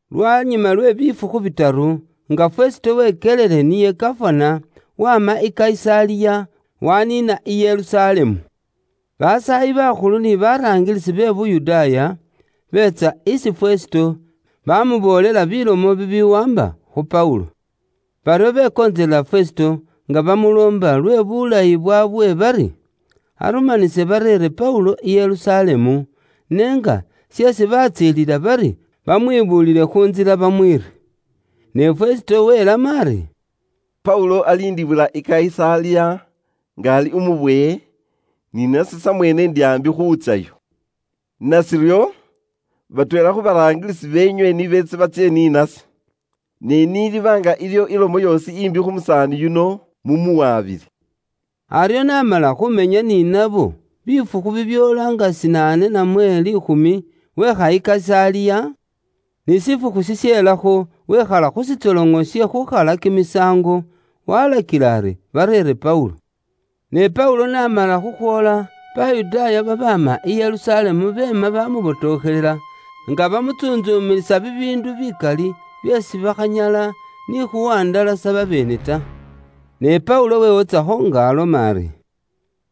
Lwanyuma lwe bifukhu bitaru, nga Fesito wekyelile niye gafana, waama i Kayisaliya, waaniina i Yerusalemu. Basaayi bakhulu ni baraangilisi be mu Buyudaaya, beetsa isi Fesito, baamuboolela bilomo bibiwaamba khu Paulo. Baryo bekontselela Fesito, nga bamuloomba lwe bulayi bwaabwe bari, arumanise bareere Paulo i Yerusalemu, ne nga sheesi batsiililila bari bamwibuulile khu ntsila bamwiire. Ne Fesito welamo ari, “Paulo aliindibwila i Kayisaliya nga ali umubowe, ni nase samweene ndi aambi khuutsyayo. Nashiryo, batweela khu baraangilisi beenywe ni beetse batsye ni nase. Ne niliiba nga iliwo ilomo yoosi imbi khu musaani yuno, mumuwabile.” Aryo n'amala khumenya ni nabo bifukhu bibyoola nga shinaane namwe liikhumi, weekha i Kayisaliya, ni shifukhu shishelakho wekhala khu shitsoloŋo she khukhalilakho kimisaango, walakila ari, bareere Paulo. Ne Paulo n'amala khukhwoola, Bayudaaya babaama i Yerusalemu beema bamubotokhelela, nga bamutsuntsumilisa bibiindu bikali, byeesi bakhanyala ni khuwandalasa babeene ta. Ne Paulo wewotsakho nga aloma ari,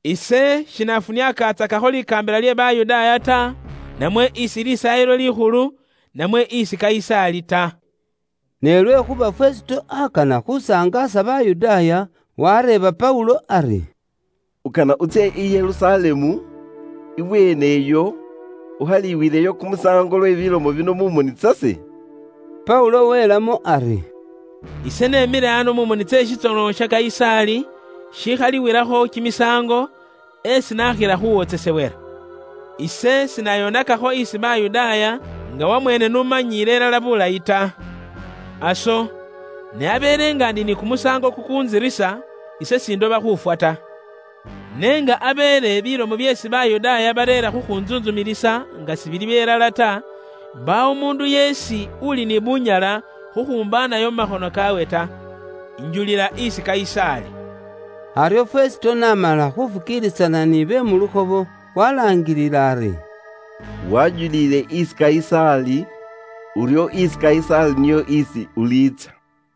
“Ise shina kholaatsakakho she bubwoonaki isi kamakaambila ke Bayudaaya, namwe isi Lisaayilo Likhulu, namwe isi Kayisaali ta.” Ne lwekhuuba Fesito akana khusangaasa Bayudaaya, wareeba Paulo ari, “Ukana utsye i Yerusalemu, ibweeneyo ukhaliwileyo kumusaango lwe bilomo bino mu moni tsase?” Paulo welamo ari, “Ise nemile ano mu moni tse shitsoloŋo sha Kayisaali, sheesi bakhalilakho kimisaango, esi nakhila khuwotsesewela. Ise sina birisakho buubi Bayudaaya, nga wamweene n'umanyiile ilala bulayi. Aso, ne abeele nga ise naakholakho buubi bwoosi bubukila ifwe, ise sindoba khuufwa ta. Ne nga abeele bilomo byeesi Bayudaaya bareera khukhuntsuntsumilisa nga sibili byelala ta, mbaawo umuundu yeesi uli ni bunyala khukhumbaanayo mu makhono kaawe ta. Ise injulila isi Kayisaali.” Aryo Fesito n'amala khuufukiilisana nibe mu lukhobo, walaangilila ari, “Wajulile isi Kayisaali, uryo isi Kayisaali niyo isi ulitsya.”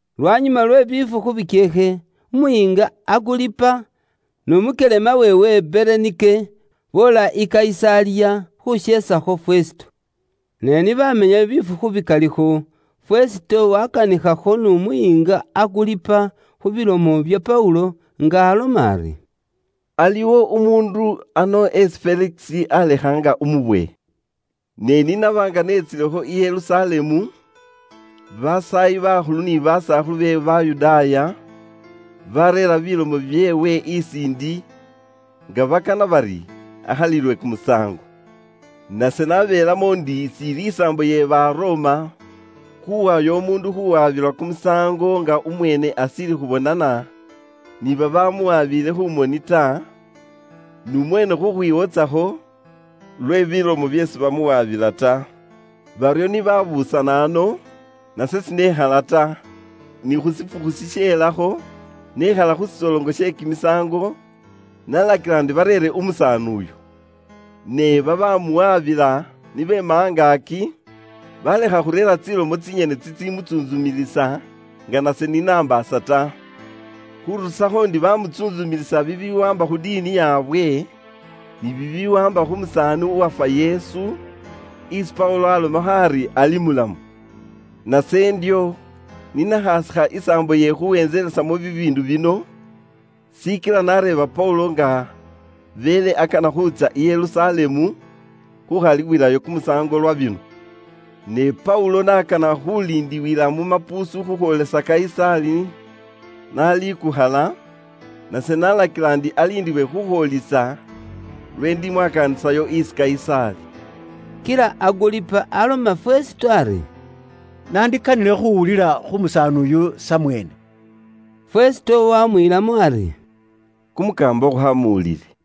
Lwanyuma lwe bifukhu bikyeekhe, umuyiinga Aguripa n'umukyelema weewe Berenike, boola i Kayisaliya khuusheesakho Fesito. Ne ni baamenyayo bifukhu bikalikho, Fesito waakanikhakho n'umuyiinga Aguripa khu bilomo bya Paulo, nga aloma ari: “Aliwo umuundu ano isi Felikisi aalekha nga umubowe. Ne ni naba nga neetsilekho i Yerusalemu, basaayi bakhulu ni basakhulu be Bayudaaya, baareera bilomo byeewe isi ndi, nga bakana bari akhalilwe kumusaango. Nase nabeelamo ndi siili isaambo ye Baroma khuuwayo umuundu khuuwabilwa kumusaango nga umweene ashiili khubonana ni babaamuwabiile khu moni ta, n'umweene khukhwiwotsakho lwe bilomo byeesi bamuwaabila ta. Baryo ni baabuusana ano, nase shinekhala ta, ne khu shifukhu shisheelakho, nekhala khu shitsoloŋo she khuukhalilakho kimisaango, naalakila ndi bareere umusaani uyo. Ne babaamuwaabila ni beema angaaki, baalekha khureera tsilomo tsinyene tsitsimutsuuntsumilisa nga nase ni nambaasa ta. Khuurusakho ndi bamutsuuntsumilisa bibiwaamba khu diini yaabwe, ni bibiwaamba khu musaani uwafwa Yesu, isi Paulo alomakho ari ali mulamu. Nase ndyo ni nakhaasikha isaambo ye khuwentselesamo bibiindu bino, shikila nareeba Paulo nga beele akana khuutsya i Yerusalemu khuukhalibwilayo kumusaango lwa bino. Ne Paulo n'akana khuuliindiwila mu mapuusu khukhwoolisa Kayisaali n'alikukhala, nase nalakila ndi bamuliinde khukhwoolisa lweesi indimwakaanisayo isi Kayisaali.” Kila Aguripa aloma Fesito ari, “Nandikanile khuuwulila khu musaani uyu samweene.” Fesito waamwiilamo ari: “Kumukaamba ukhaamuwulile.”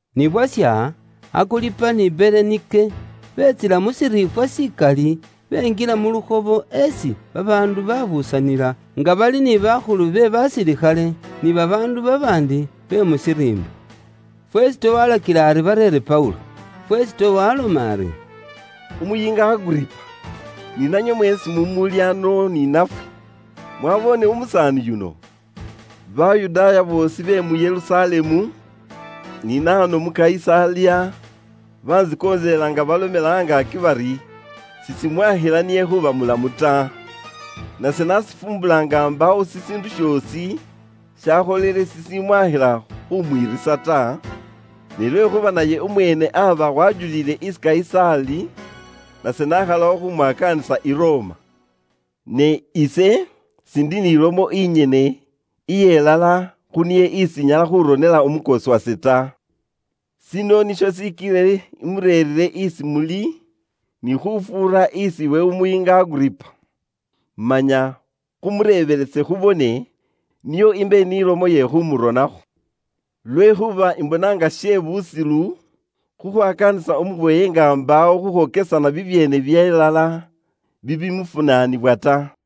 Ni bwasha, Aguripa ni Berenike beetsila mu shiriifwa shikali, benjila muntsu iye lukhobo nga bali ni bakhulu be basilikhale, ni babaandu babaandi be mu shiriimba. Fesito walakila ari bareere Paulo. Fesito waaloma ari, “Umuyiinga Aguripa, ni nanywe mweesi mumuuli ano ni nafwe, mwaboone umusaani yuno? Bayudaaya boosi be mu Yerusalemu ni nahano mu Kayisaliya bantsikontselela nga balomela angaaki bari, sishimwakhila niye khuuba mulamu ta. Nase ni nashifumbula nga mbaawo shishiindu shoosi shakholele shishimwakhila khumwiirisa ta, ni lwekhuuba naye umweene aba wajuliile isi Kayisaali nase nakhalawo khumwakaanisa i Roma. Ne ise siindi ni lomo inyene iyelala khu niye isi inyala khuronela umukoosi wase ta. Shino nisho shikilile imureerire isi muli, ni khufuura isi iwe umuyiinga Aguripa. Manya khumureebelese khubone, nio imbe ni lomo iye khumuronakho. Lwekhuuba imbona nga she busilu khukhwakaanisa umubowe nga mbaawo khukhwokesana bibyeene byelala bibimufunaanibwa ta.”